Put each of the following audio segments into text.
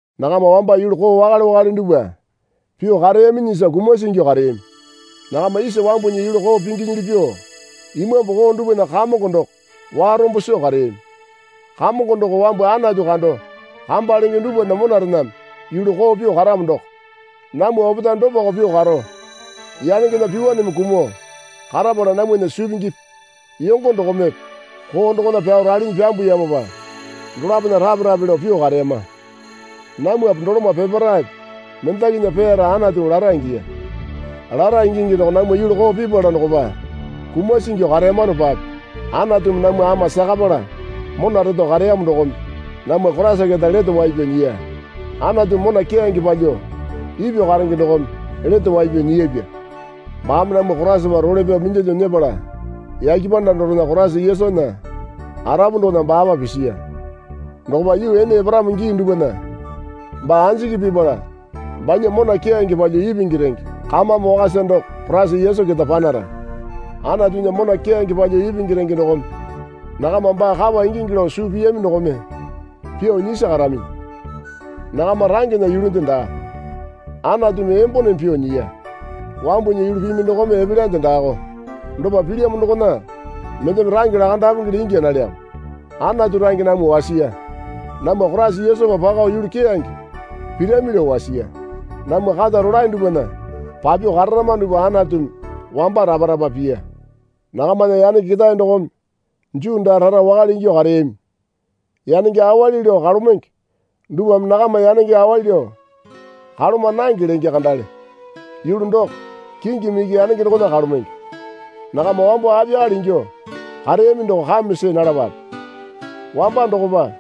Nakama wamba yulu koo wakale wakale dupwa pyuo kareyaminyisa kumasi ingyuo kareyami. Nakama isa wambunya yulu koo pinginyili pyuo imambu koo dupwana kamongo doko warombo soo kareyami. Kamongo doko wambu Anatu kando kamba lenge dupwana monarename yulu koo pyuo karamo doko. Namwa opetae dopako pyuo karo yanengena pyuwaneme kumuo karapala namwana suu pingipi yongo dokomepe koo dokona pyao ralinyi pyambuyamopa dolapona rape rape lao pyuo kareyama. Namwape doloma peparaepe mendakinya peyara Anatumi lara ingiya. Lara ingingi doko namwa yulu koo pipala dokopa kumasi ingyuo kareyamanopape Anatumi namwa ama sakapala mona reto kareyamo dokome namwa Koraisa keta lete wai pyao nyiya. Anatumi mona keyange palyuo ipyuo karenge dokome lete wai pyao nyiyapya. Baame namwa Koraisapa role pyao minyalyuo nyepala yake panda dorena Koraisa Yesunya arapu dokona baapa pisiya. Dokopa yuu ene eparamo gii dupwana baa anjiki pipala banya mona keyange palyuo ipingi renge kamame wakasa doko Koraisa Yesu keta panara. Anatunya mona keyange palyuo ipingi renge dokome nakama baa kapa ingingi lao suu piyami dokome pyuo nyisi karaminyi. Nakama rangena yulunde daa. Anatumi emboneme pyuo nyiya. Wambunya yulu pimi dokome epelyande daako. Dopa pilyamo dokona mendeme range lakandapengele ingya nalyamo. Anatu range namwa wasiya. Namwa Koraisa Yesupa pako yulu keyange pirami lao wasiya. Namwa kata rolae dupwana papyuo kararama dupwa Anatumi wamba rapa rapa piya. Nakamana yanenge ketae dokome Juu daa rara wakale ingyuo kareyami. Yanenge awali lao kalomenge dupwame nakama yanenge awali lao kaloma nange lenge kandale. (Yulu doko kingimi iki yanenge dokona kalomenge.) Nakama wambo apiyakale ingyuo kareyami doko kame see nalapape. Wamba dokopa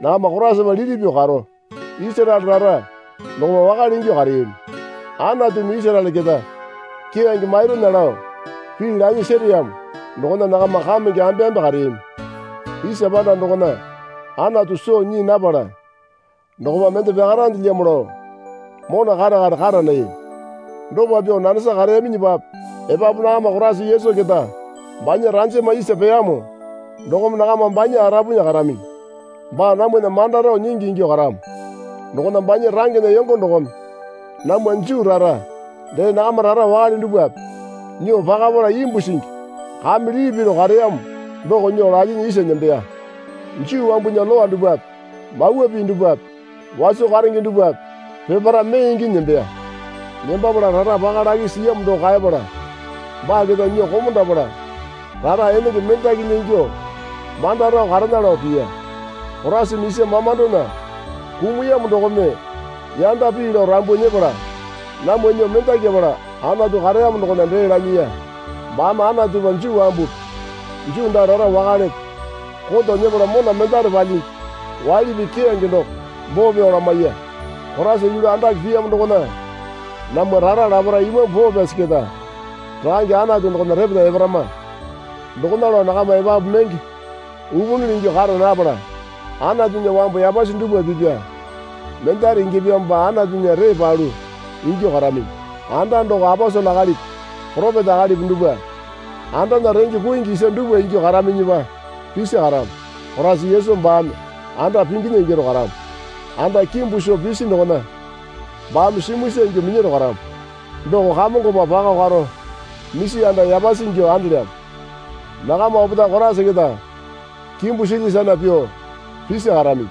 nakama Koraisapa liti pyuo karo, Isaraele rara dokopa wakale ingyuo kareyami. Anatumi Isaraele keta keyange mairunya lao pii lanyi sereyamo dokona nakama kamenge ambe ambe kareyami. Isa panda dokona Anatu soo nyii napala dokopa mende pyakarandelyamo lao mona kare kare kara nayami. Dopa pyuo nanesa kareyaminyipape epapu nakama Koraisa Yesu keta banya ranjama isa peyamo dokome nakama banya arapunya karaminyi. Baa namwana manda rao nyingi ingyuo karamo dokona banya rangena yongo dokome namwa Juu rara dee nakama rara wakale dupwape nyuo pakapala imbu singi kame lili piru kareyamo doko nyuo lalyinyi isa nembeya. Juu wambunya Lowa dupwape mawa pii dupwape waso karenge dupwape peparae mee inginyi nembeya. Nembapala rara paka lakisi siyamo doko kaepala baa keta nyuo komondapala rara enenge mendakinya ingyuo manda rao karena lao piya. Koraisame isa mamandona kumuyamo dokome yanda pii lao rambu nyepala namwa nyuo mendakyapala Anatu kareyamo dokona dee lanyiya. Baame Anatupa Juu wambupi Juu daa rara wakalepe koto nyepala mona mendare palyingi waili pii keyange doko boo pyao lamaiya. Koraisa yulu andake piyamo dokona namwa rara laparae Imambu Poo Pyasi keta Rakange Anatu dokona repeta eparama. Dokona lao nakama epapu menge upunyili ingyuo kara napala Anatunya wambu yapasi dupwa pipya mendare ingyapyamopa Anatunya ree palu ingyuo karaminyi. Anda doko aposele akalipi poropeta akalipi dupwa andana renge kuingi isa dupwa ingyuo karaminyipa pisi karamo. Koraisa Yesu baame anda pinginya ingyaro karamo. Anda kimbu soo pisi dokona baame simuisa ingyuo minyaro karamo. Doko Kamongopa pako karo misi anda yapasi ingyuo andelyamo. Nakama opetae Koraisa keta kimbu silya sana pyuo pisi karaminyi.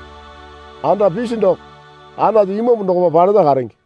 Anda pisi doko Anatu Imambu dokopa paleta karenge.